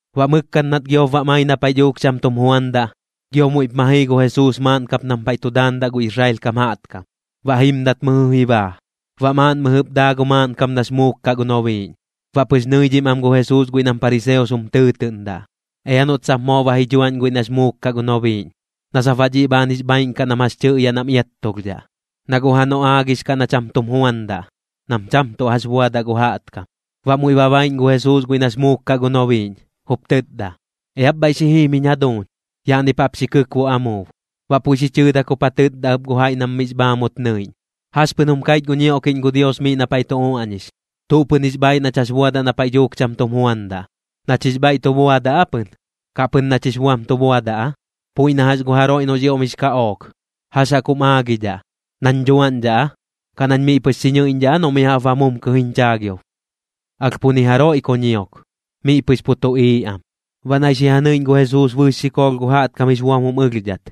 Baꞌ mɨkkat nat giop bam ai na paiꞌ dhuuk cham tum juandaꞌ, gio muiꞌp ma jii gu Jesuus maaꞌn kap nam paiꞌ tu daandaꞌ gu Israel kam jaꞌtkam, baꞌ jimdat mɨjɨ ji baa. Baꞌ maaꞌn mɨjɨp daa gu maaꞌnkam nax muuk kaꞌ gu nobiiꞌñ. Baꞌ pɨx nɨidhim am gu Jesuus guiꞌ nam pariseos jum tɨɨtɨꞌndaꞌ, ea noꞌt sap moo ba ji dhuaꞌñ guiꞌ nax muuk kaꞌ gu nobiiꞌñ, na sap baꞌ dhiꞌ bhaan jix bhaaiꞌn kaꞌ nam jax tɨꞌyaꞌ nam iattulhdhaꞌ. Na guꞌ janoꞌ aagix kaꞌ na cham tum juandaꞌ, nam cham tuꞌ jax buadaꞌ gu jaꞌtkam. Baꞌ muiꞌ ba baiꞌñ gu Jesuus guiꞌ nax muuk kaꞌ gu nobiiꞌñ, jup tɨtda: ―Eap bhaiꞌ xi jim jiñ jaduuñ. Yaꞌni jaꞌp jap xi kɨkbuꞌ amuub. Baꞌ puiꞌ xi chɨɨdak jup ja tɨtda ɨp gu jaiꞌ guiꞌ nam miꞌx bhaamut nɨiꞌñ: ―¿Jax pɨn jum kaiꞌch gu ñioꞌkiꞌñ gu Dios miꞌ na paiꞌ tu uaꞌñix? ¿Tuꞌ pɨn jix bhaaiꞌ nach jax buadaꞌ na paiꞌ dhuuk cham tum juandaꞌ, nach jix bhaiꞌ tu buadaꞌ aa pɨn, kaꞌ pɨn nach jix buam tu buadaꞌ aa? Puiꞌ na jax gu jaroiꞌ noꞌx ioꞌm jix kaꞌook, ¿jax jaꞌk jum aagidhaꞌ, nañ dhuaꞌñdhaꞌ aa, kaꞌ nañ miꞌ pɨx xi ñɨiꞌñdhaꞌ aa noꞌ mi jaꞌp ba mumkɨ jiñ chaagiob? Alh pu ni jaroiꞌ ku ñiok, miꞌ pɨx pu tuꞌiiꞌ am. Baꞌ naiꞌ xi ja nɨiꞌñ gu Jesuus bɨɨx xikoolh gu jaꞌtkam jix buam jum ɨlhdhat,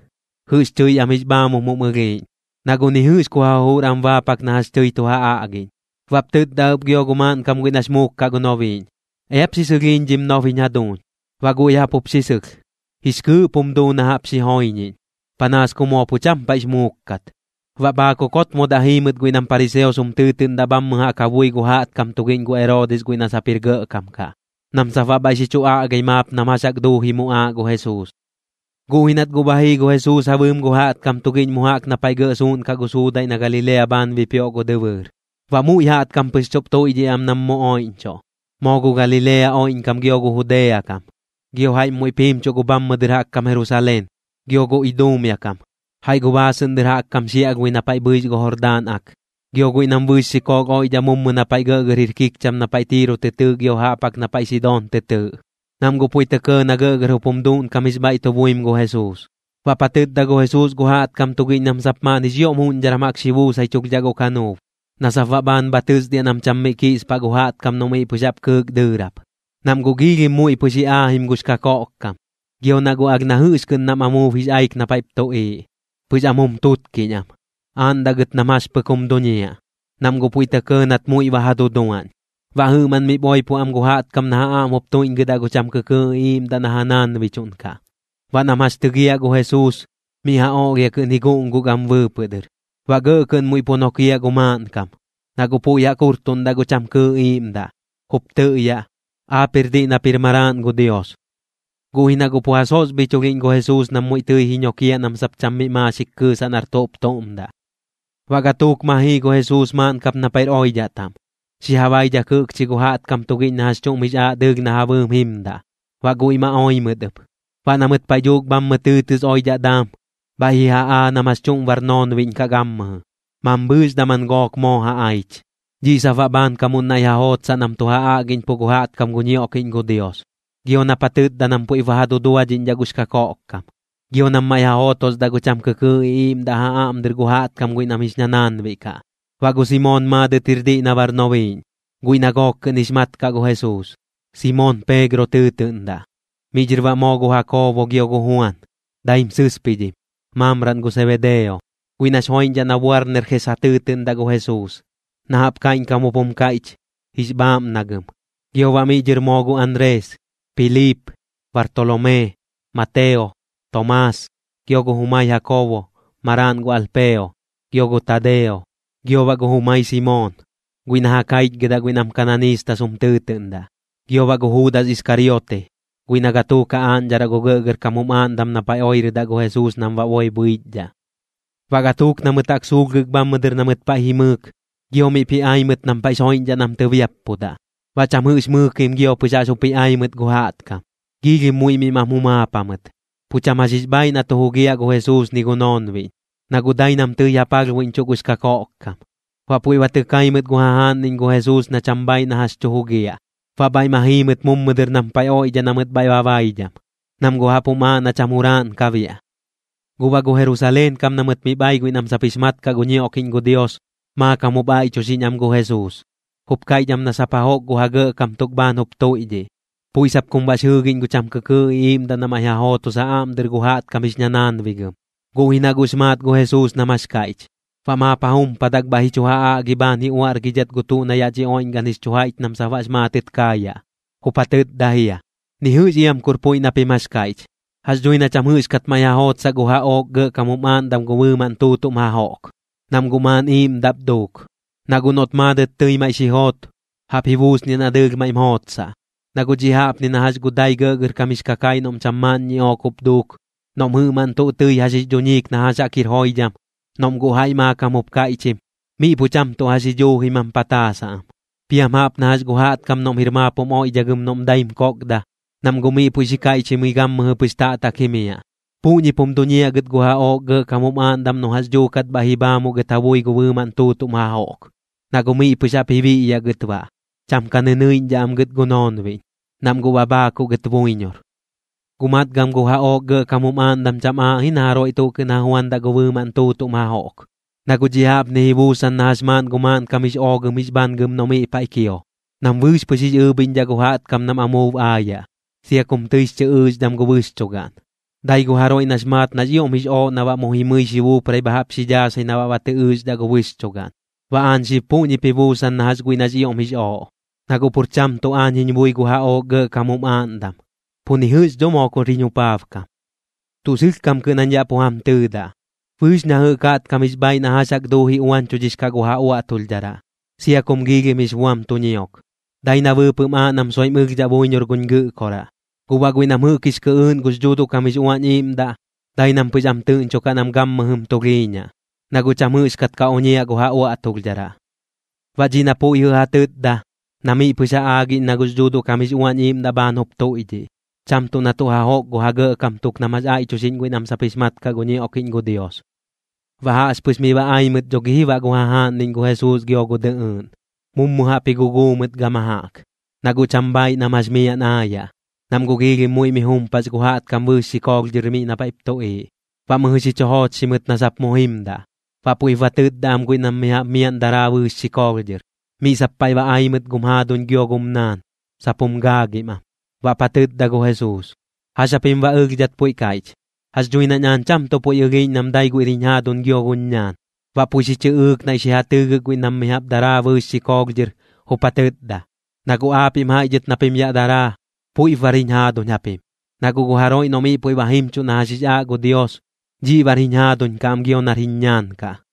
jɨꞌx tɨi am jix bhaamum jum ɨlhiiꞌñ, na guꞌ ni jɨꞌx ku ja jujur am baapak na jax tɨi tu ja aꞌgiꞌñ. Baꞌp tɨtda ɨp gio gu maaꞌnkam guiꞌ nax muuk kaꞌ gu nobiiꞌñ: ―Eap xi sɨlhiiñ dhim nob jiñ jaduuñ. Baꞌ guiꞌ jaꞌp jup xi sɨlh, jix kɨɨꞌp jum duu na jaꞌp xi joiñiꞌñ, panaas ku moo pu cham paiꞌx muuk kat. Baꞌ bhaakuk jotmodaꞌ jii mɨt guiꞌ nam pariseos jum tɨɨtɨꞌndaꞌ bhammɨ jaꞌk ja bui gu jaꞌtkam tugiꞌñ gu Eroodis guiꞌ na sap jir gɇꞌkam kaꞌ, nam sap baꞌ bhaiꞌ xi chu aꞌgai maap nam jax jaꞌk duuji muꞌaaꞌ gu Jesuus. Guꞌ ji nat guꞌ ba jii gu Jesuus ja bɨɨm gu jaꞌtkam tugiꞌñ mummu jaꞌk na paiꞌ gɇꞌ suuꞌnkaꞌ gu suudaiꞌ na Galilea bhaan bipioꞌ gu dɨbɨɨr. Baꞌ muiꞌ jaꞌtkam pɨx chuꞌp tuiꞌdhiꞌ am nam mu oiꞌñchuꞌ, moo gu Galilea oiꞌñkam gio gu Judea kam. Gio jaiꞌm muiꞌp jimchuꞌ gu bhammɨ dɨr jaꞌk kam Jerusaleen, gio gu Idumea kam, jaiꞌ gu baasɨꞌn dɨr jaꞌk kam xiaꞌlhbui na paiꞌ bhɨix gu Jordaan Ak, gio guiꞌ nam bɨɨx xikoolh oiꞌdhaꞌ mummu na paiꞌ gɇꞌgɇr jir kikcham na paiꞌ Tiiro tɨ tɨɨꞌ gio jaꞌp jaꞌk na paiꞌ Sidoon tɨ tɨɨꞌ, nam guꞌ puiꞌ tɇ kɇɇ na gɇꞌgɇr jup jum duuꞌnkam jix bhaiꞌ tu buim gu Jesuus. Baꞌp ja tɨtda gu Jesuus gu jaꞌtkam tugiꞌñ nam sap maaꞌn jix ioꞌm juꞌñdharan jaꞌk xi buusaichulhdhaꞌ gu kanuub, na sap baꞌ bhaan bha tɨsdiaꞌ nam cham miꞌ kiꞌspaꞌ gu jaꞌtkam noꞌ miꞌ pɨx jaꞌp kɨɨk dɨɨrap. Nam guꞌ giilhim muiꞌ pɨx ji aajim gux kakoꞌkkam, gio nam guꞌ alh na jɨꞌx kɨꞌn nam amuub jix aik na paiꞌp tuꞌiiꞌ, pɨx am jum tutkiꞌñ am, aaꞌndaꞌ gɨt nam jax pɨk jum duñiaꞌ, nam guꞌ puiꞌ tɇ kɇɇ nat muiꞌ ba ja duduaꞌñ. Baꞌ jɨꞌmaꞌn miꞌp oipo am gu jaꞌtkam na ja aꞌm jup tuiꞌñgɨdaꞌ gu cham kɨkɨɨꞌ iꞌiiꞌmdaꞌ na ja naanbichuꞌnkaꞌ. Baꞌ nam jax tɨgiaꞌ gu Jesuus, miꞌ ja oꞌlhia kɨꞌn ji guꞌnguk am bɨɨpɨꞌ dɨr, baꞌ gɇꞌ kɨꞌn muiꞌ pu nokiaꞌ gu maaꞌnkam, na guꞌ puiꞌ jaꞌk jurtuꞌndaꞌ gu cham kɨɨꞌ iiꞌmdaꞌ, jup tɨꞌyaꞌ: ―Aap jir diꞌ nap jir Maraaꞌn gu Dios. Guꞌ ji na guꞌ pu ja sosbhichulhiꞌñ gu Jesuus nam muiꞌ tɨi ji ñokiaꞌ nam sap cham miꞌ maaxik kɨɨsaꞌ nar tuꞌp tuꞌm daꞌ. Baꞌ gatuuk ma jii gu Jesuus maaꞌn kap na paiꞌr oidhaꞌ taꞌm, xi ja baidhak jɨꞌkchi gu jaꞌtkam tugiꞌñ na jax chuꞌm jix aaꞌ dɨɨlh na ja bɨɨm jimdaꞌ, baꞌ guiꞌ ma oi mɨt ɨp. Baꞌ na mɨt paiꞌ dhuuk bhammɨ tɨɨtɨs oidhaꞌ daam, bhaiꞌ ji ja aa nam jax chuꞌm bar noonbiꞌñ kaꞌ gammɨjɨ, mambhɨɨx daman gook moo aich. Dhiꞌ sap baꞌ bhaankamuꞌn naiꞌ ja jootsaꞌ nam tu ja aꞌgiꞌñpuꞌ gu jaꞌtkam gu ñioꞌkiꞌñ gu Dios, gio nap ja tɨtda nam puiꞌp ba ja duduadhiꞌñdhaꞌ gux kakoꞌkkam, gio nam maiꞌ ja jootosdaꞌ gu cham kɨkɨɨꞌ iꞌiiꞌmdaꞌ ja aꞌm dɨr gu jaꞌtkam guiꞌ nam jix ñanaanbiꞌ kaꞌ. Baꞌ gu Simoon maadɨt jir diꞌ na bar nobiiꞌñ, guiꞌ na gook kɨꞌn jix mat kaꞌ gu Jesuus, Simoon Peegro tɨɨtɨꞌndaꞌ. Miꞌ dhɨr baꞌ moo gu Jakoobo gio gu Juan, daim sɨspidhim, maamraꞌn gu Sebedeo, guiꞌ nax joiꞌñdhaꞌ na Boarnerjes ja tɨɨtɨꞌndaꞌ gu Jesuus, na jaꞌp kaiꞌñkam jup jum kaiꞌch: Jix bhaaꞌmnagɨm. Gio baꞌ miꞌ dhɨr moo gu Anrees, Piliip, Bartolomee, Mateo, Tomaas, gio gu jumai Jakoobo, maraaꞌn gu Alpeo, gio gu Tadeo, gio baꞌ gu jumai Simoon, guiꞌ na ja kaichgɨdaꞌ guiꞌ nam kananiistas jum tɨɨtɨꞌndaꞌ, gio baꞌ gu Juudas Iskariote, guiꞌ na gatuuk ja aaꞌñdharaꞌ gu gɇꞌgɇrkam jum aaꞌndam na paiꞌ oirɨdaꞌ gu Jesuus nam baꞌ boi bhɨichdhaꞌ. Baꞌ gatuuk na mɨt jaꞌk suulhgɨk bhammɨ dɨr na mɨt paiꞌ jimɨɨk, gio miꞌp ji ai mɨt nam paiꞌx joiꞌñdhaꞌ nam tɨbiappudaꞌ. Baꞌ cham jɨꞌx mɨɨkim gio pɨx jaꞌx jup ji ai mɨt gu jaꞌtkam, giilhim muiꞌ miꞌ mam jumaap jamɨt, pu cham jax jix bhaaiꞌ na tu jugiaꞌ gu Jesuus ni gu noonbiꞌñ, na guꞌ dai nam tɨi ja palhbuiꞌñchuꞌ gux kakoꞌkkam. Baꞌ puiꞌ ba tɨ kai mɨt gu jajaaꞌnniꞌñ gu Jesuus na cham bhaaiꞌ na jax tu jugiaꞌ. Baꞌ bhaiꞌ ma jii mɨt mummu dɨr nam paiꞌ oiꞌdhaꞌ na mɨt bhaiꞌ ba baidham, nam guꞌ jaꞌp jum aaꞌ na cham juraaꞌn ka biaꞌ. Guꞌ baꞌ gu Jerusaleen kam na mɨt miꞌp ai guiꞌ nam sap jix mat kaꞌ gu ñioꞌkiꞌñ gu Dios, maakam jup aiꞌchuxiꞌñ am gu Jesuus, jup kaiꞌch am na sap jajoꞌk gu ja gɇꞌkam tuk bhaan jup tuiꞌdhiꞌ, puiꞌ sap kum baꞌx jɨɨgiꞌñ gu cham kɨkɨɨꞌ iꞌiiꞌmdaꞌ na maiꞌ ja jootos ja aꞌm dɨr gu jaꞌtkam jix ñanaanbigɨm. Guꞌ ji na guꞌx maat gu Jesuus nam jax kaiꞌch, baꞌ maap ja jumpadak bhaiꞌ ji chu ja aꞌgi bhaan ji chu uaꞌrgidhidhat gu tuꞌ na yaꞌ dhi oiꞌñgaꞌn jix chu jaiꞌch nam sap baꞌx maatɨt kaayaꞌ. Jup ja tɨtda jia: ―Ni jɨꞌx iam kur puiꞌ na pim jax kaiꞌch. Jax dhui na cham jɨꞌxkat maiꞌ ja jootsaꞌ gu jaꞌook gɇꞌkam jum aaꞌndam gu bɨɨmaꞌn tuutuꞌm jajoꞌk, nam guꞌ maaꞌn iiꞌmdaꞌp duuk. Na guꞌ noꞌt maadɨt tɨi maiꞌ xi joot, jaꞌp ji buusniaꞌ na dɨɨlh maiꞌm jootsaꞌ. Na guꞌ dhiꞌ jaꞌpni na jax gu dai gɇꞌgɇrkam jix kakaiꞌ noꞌm cham maaꞌn ñiꞌook jup duuk, noꞌm jɨꞌmaꞌn tuꞌ tɨi jax jix dhuñiim na jax jaꞌk jir joidham, noꞌm guꞌ jaiꞌ maakam jup kaiꞌchim, miꞌ pu cham tuꞌ jax ji dhuuji mam pataasaꞌ am. Piam jaꞌp na jax gu jaꞌtkam noꞌm jir maap jum oiꞌdhagɨm noꞌm daim kokda, nam guꞌ miꞌ puiꞌ xi kaiꞌchimɨi gammɨjɨ pɨx taꞌtak jimiaꞌ. Puꞌñip jum duñiaꞌ gɨt gu jaꞌook gɇꞌkam jum aaꞌndam noꞌ jax dhuukat bhaiꞌ ji bhaamuꞌ gɨt ja bui gu bɨɨmaꞌn tuutuꞌm jajoꞌk, na guꞌ miꞌ pɨx jaꞌp ji biꞌyaꞌ gɨt baꞌ, cham ka nɨnɨiꞌñdhaꞌ am gɨt gu noonbiꞌñ, nam guꞌ ba bhaakuꞌ gɨt buiñor. ’Guꞌ matgam gu jaꞌook gɇꞌkam jum aaꞌndam cham aaꞌ ji na jaroiꞌ tuꞌ kɨꞌn ja juandaꞌ gu bɨɨmaꞌn tuutuꞌm jajoꞌk. Na guꞌ dhiꞌ jaꞌpni ji buusan na jax maaꞌn gu maaꞌnkam jix oogɨm jix bhangɨm noꞌ miꞌ paiꞌ kio, nam bɨɨx pɨx jix ɨɨbhiꞌñdhaꞌ gu jaꞌtkam nam amuub aayaꞌ, sia kum tɨix chɨ ɨɨxdham gu bɨxchugaꞌn. Dai gu jaroiꞌ noꞌx maat nax ioꞌm jix ooꞌ na baꞌ mu jimɨi xi buuprai bha jaꞌp xi dhaasai na baꞌ ba tɨ ɨɨxdhaꞌ gu bɨxchugaꞌn. Baꞌ aañ xib puꞌñip ji buusan na jax guiꞌ nax ioꞌm jix ooꞌ, na guꞌ pur cham tuꞌ aañ jiñ bui gu jaꞌook gɇꞌkam jum aaꞌndam, pu ni jɨꞌx dho moo kur jiñ jupaabkam. ’Tuꞌ sɨlhkam kɨꞌn jañ yaꞌ pu jam tɨɨdaꞌ, bɨɨx na jɨꞌk jaꞌtkam jix bhaaiꞌ na jax jaꞌk duuji uañchudhix kaꞌ gu ja uaꞌtulhdharaꞌ, sia kum giilhim jix buam tu ñiok, dai na bɨɨpɨꞌm aaꞌ nam soiꞌm ɨlhdhaꞌ buiñor guñ Gɨꞌkoraꞌ. Guꞌ baꞌ guiꞌ nam jɨꞌk jix kɨꞌɨɨꞌn gux Dhuuduꞌ kam jix Uañ Iiꞌmdaꞌ, dai nam pɨx am tɨꞌñchukaꞌ nam gammɨjɨm tulhiiñaꞌ, na guꞌ cham jɨꞌxkat ka oñiaꞌ gu ja uaꞌtulhdharaꞌ. Baꞌ dhiꞌ na puiꞌ jɨꞌ ja tɨtda, na miꞌ pɨx ja aagiꞌñ na gux Dhuuduꞌ kam jix Uañ Iiꞌmdaꞌ bhaan jup tuiꞌdhiꞌ, cham tuꞌ na tuꞌ jajoꞌk gu ja gɇꞌkam tuk nam jax aiꞌchuxiꞌñ guiꞌ nam sap jix mat kaꞌ gu ñioꞌkiꞌñ gu Dios. Baꞌ jaꞌxpɨx miꞌ ba ai mɨt dho gi ji baꞌ gu jajaaꞌnniꞌñ gu Jesuus gio gu dɨꞌɨɨꞌn, mummu jaꞌp ji guguu mɨt gama jaꞌk, na guꞌ cham bhaiꞌ nam jax miaꞌn aayaꞌ, nam guꞌ giilhim muiꞌ mi jumpax gu jaꞌtkam bɨɨx xikoolh dhɨr miꞌ na paiꞌp tuꞌiiꞌ. Baꞌ mɨjɨ xi chu joochxi mɨt na sap mu jimdaꞌ. Baꞌ puiꞌp ba tɨtda am guiꞌ nam mi jaꞌp miaꞌn daraa bɨɨx xikoolh dhɨr: ―Miꞌ sap paiꞌ ba ai mɨt gum jaaduñ gio gum naan, sap jum gaagim am. Baꞌp ja tɨtda gu Jesuus: ―¿Jax japim baꞌ ɨlhdhat puiꞌ kaiꞌch? Jax dhui nañ aañ cham tuꞌ puiꞌ ɨlhiiꞌñ nam dai guiꞌr jiñ jaaduñ gio guñ ñaan. Baꞌ puiꞌ xi chɨꞌɨɨk naiꞌ xi ja tɨɨgɨk guiꞌ nam mi jaꞌp daraa bɨɨx xikoolh dhɨr, jup ja tɨtda: ―Na guꞌ aapiꞌm jaiꞌ dhɨt na pim yaꞌ daraa, puiꞌp bar jiñ jaaduñ japim. Na guꞌ gu jaroiꞌ noꞌ miꞌ puiꞌ ba jimchuꞌ na jax jix aaꞌ gu Dios, dhiꞌ bar jiñ jaduuñ kaꞌ gio nar jiñ ñaan kaꞌ.